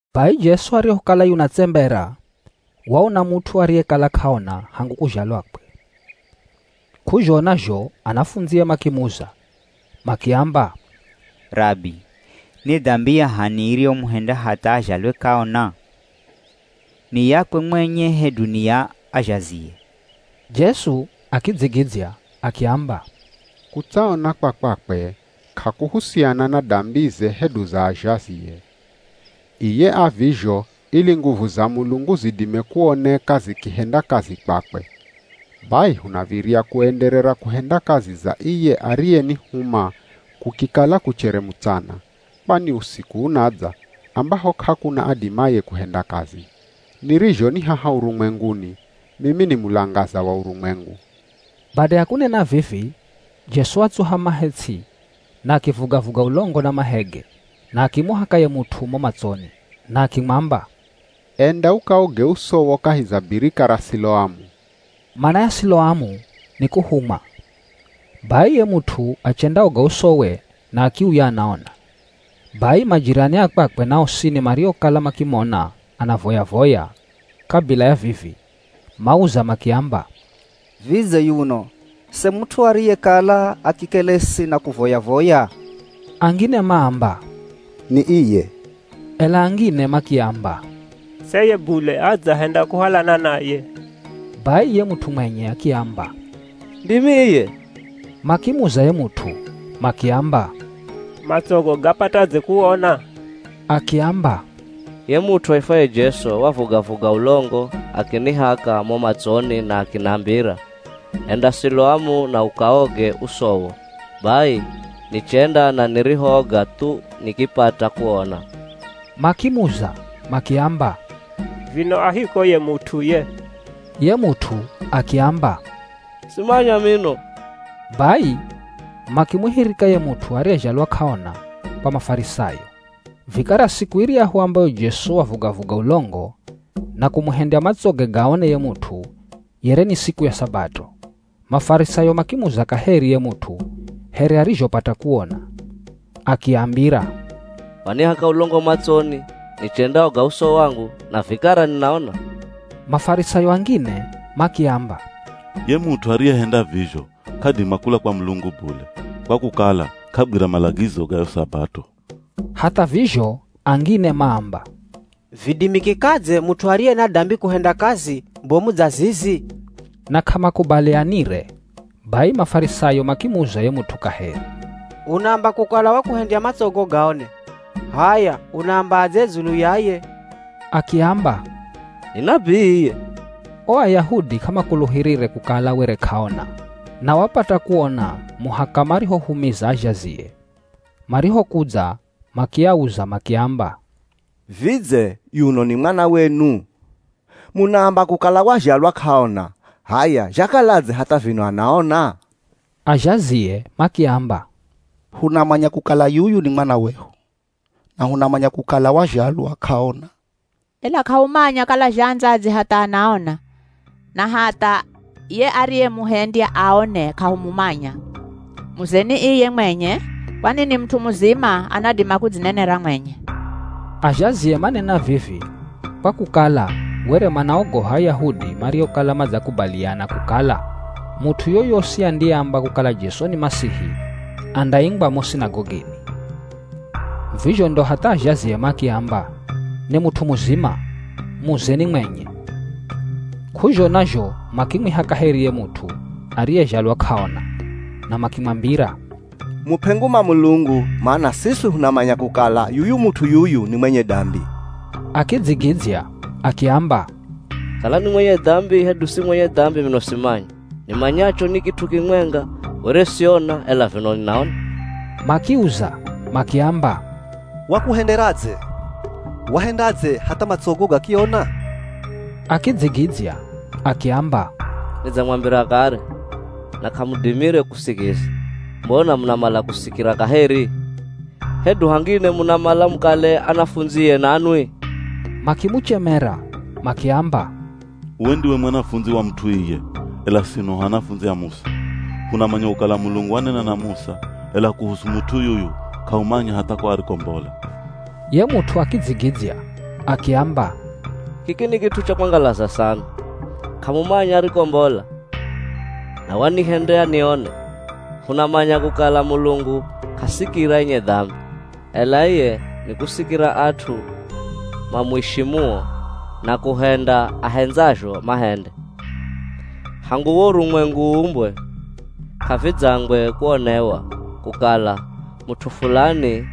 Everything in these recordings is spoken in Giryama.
Bai Jesu arihokala yunatsembera, waona mut'u ariyekala k'aona hangu kuzhalwakwe. K'uzhona zho anafundzie makimuza, makiamba, “Rabi ni dambi ya h'ani iriyomuhendya hatha azhalwe k'aona? Ni yakwe mwenye hedu ni ya azhazie?” Jesu akidzigidzya akiamba, “Kutsaona kwa kwakwe k'akuhusiana na dambize hedu za azhazie. Iye avizho ili nguvu za Mulungu zidime kuoneka zikihenda kazi kwakwe. Bai hunav̱irya kuenderera kuhenda kazi za iye ariyenihuma kukikala kuchere mutsana, kwani usiku unadza ambaho k'akuna adimaye kuhenda kazi. Nirizho ni haha urumwenguni, mimi ni mulangaza wa urumwengu.” Bada ya kunena vivi Jesu watsuha mahe ts'i na akivuga-vuga ulongo na mahege na akimuhaka ye mut'u mo matsoni, na akimwamba, “Enda ukaoge usowo kahi za birika ra Siloamu.” (Mana ya Siloamu ni kuhumwa.) Bai ye mut'u achendaoga usowe na akiuya anaona. Bai majirani a kwakwe na osini mariokala makimona anavoya-voya kabila ya vivi, mauza makiamba, “Vidze yuno se mut'u ariyekala akikelesi na kuvoya-voya?” Angine maamba, “Ni iye” Ela angine makiamba, “Seye bule adzahenda kuhalana naye.” Bai ye mut'u mwenye akiamba, “Ndimi iye.” Makimuza ye mut'u, makiamba, “Matsogo gapatadze kuona?” Akiamba, “Ye mut'u aifwaye Jesu wavuga-vuga ulongo, akinihaka mo matsoni na akinambira, ‘Enda Siloamu na ukaoge usowo.’ Bai nichenda na nirihooga thu nikipata kuona.” Makimuza makiamba, “Vino a hiko ye mut'u ye?” Ye mut'u akiamba, “Simanya mino!” Bai makimuhirika ye mut'u ariyezhalwa k'aona kwa Mafarisayo. Vikara siku iryahu ambayo Jesu wavuga-vuga ulongo na kumuhendya matsoge gaone ye mut'u, yere ni siku ya Sabato. Mafarisayo makimuza kaheri ye mut'u here arizhopata kuona. Akiambira, “Wanihaka ulongo matsoni, nichendaoga uso wangu na vikara ninaona.” Mafarisayo angine makiamba, “Ye mut'u ariyehenda vizho k'adima kula kwa Mulungu bule, kwa kukala k'agwira malagizo ga yo Sabato.” Hatha vizho angine maamba, “Vidimikikadze mut'u ariye na dambi kuhenda kazi bomu dza zizi?” Na k'amakubalianire. Bai Mafarisayo makimuza ye mut'u kaheri, “Unaamba kukala wakuhendya matsogo gaone. H'aya unaambadze dzulu ya ye?” Akiamba, “Ni nabii iye.” O Ayahudi k'amakuluhirire kukala were k'aona na wapata kuona muhaka marihohumiza azhazie. Marihokudza makiauza makiamba, “Vidze yuno ni mwana wenu? Munaamba kukala wazhalwa k'aona, h'aya zhakaladze hatha vino anaona?” Azhazie makiamba, “Hunamanya kukala yuyu ni mwana wehu, na hunamanya kukala wazhalwa k'aona. Ela k'ahumanya kala zhaandzadze hatha anaona, na hatha ye ariyemuhendya aone k'ahumumanya. Muzeni iye mwenye, kwani ni mut'u muzima anadima kudzinenera mwenye!” Azhazie manena vivi kwa kukala were manaogoha Ayahudi mariokala madzakubaliana kukala mut'u yoyosi andiyeamba kukala Jesu ni Masihi andaingwa mo sinagogini. Vizho ndo hatha azhazie makiamba, “Ni mut'u muzima, muzeni mwenye.” K'uzhona zho makimwiha kaheri ye mut'u ariyezhalwa k'aona, na makimwambira, “Mup'e nguma Mulungu, mana siswi hunamanya kukala yuyu mut'u yuyu ni mwenye dambi.” Akidzigidzya akiamba, “Kala ni mwenye dambi hedu si mwenye dambi mino simanya. Nimanyacho ni kit'u kimwenga, were siona, ela vino ninaona.” Makiuza makiamba, “Wakuhenderadze? Wahendadze hatha matsogo gakiona?” Akidzigidzya akiamba, “Nidzamwambira kare na k'amudimire kusikiza. Mbona munamala kusikira kaheri? Hedu hangine munamala mukale anafundzie nanwi?” Makimuchemera makiamba, “Uwe ndiwe mwanafundzi wa mut'u iye, ela sino hu anafundzi a Musa. Hunamanya kukala Mulungu wanena na Musa, ela kuhusu mut'u yuyu k'ahumanya hatha ko arikombola.” Ye mut'u akidzigidzya akiamba, “Kiki ni kit'u cha kwangalaza sana! K'amumanya arikombola, na wanihendya nione! Hunamanya kukala Mulungu k'asikira enye dambi, ela iye nikusikira at'u mamuishimuo na kuhenda ahendzazho mahende. Hangu wo urumwengu uumbwe, k'avidzangwe kuonewa kukala mut'u fulani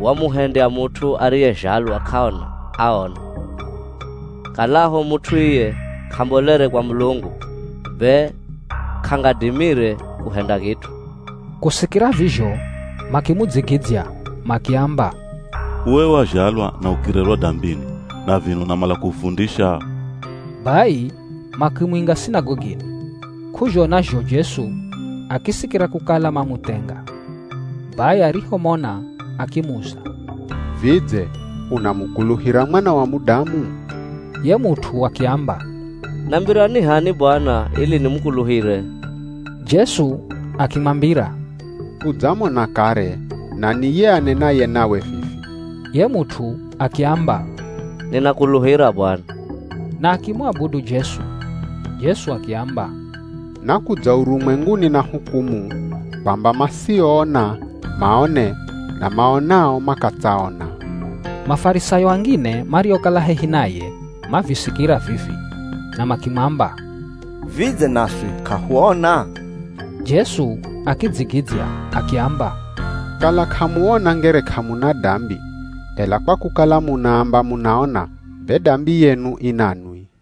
wamuhendya mut'u ariyezhalwa k'aona aone. Kalaho mut'u iye k'ambolere kwa Mulungu, be k'angadimire kuhenda kit'u.” Kusikira vizho makimudzigidzya makiamba, “Uwe wazhalwa na ukirerwa dambini na vino unamala kuhufundisha?” Bai makimuinga sinagogini. K'uzhona zho Jesu akisikira kukala mamuthenga. Bai arihomona akimuza, “Vidze unamukuluhira Mwana wa Mudamu?” Ye mut'u akiamba, “Nambira ni h'ani bwana ili nimukuluhire!” Jesu akimwambira, “Udzamona kare na ni ye anenaye nawe vivi.” Ye mut'u akiamba, “Ninakuluhira Bwana,” na akimuabudu Jesu. Jesu akiamba, “Nakudza urumwenguni na hukumu kwamba masioona, maone na maonao makatsaona.” Mafarisayo angine mariokala hehi naye mavisikira vivi na makimwamba, “Vidze naswi k'ahuona?” Jesu akidzigidzya akiamba, “Kala k'amuona ngere k'amuna dambi, ela kwa kukala munaamba munaona be dambi yenu i nanwi.”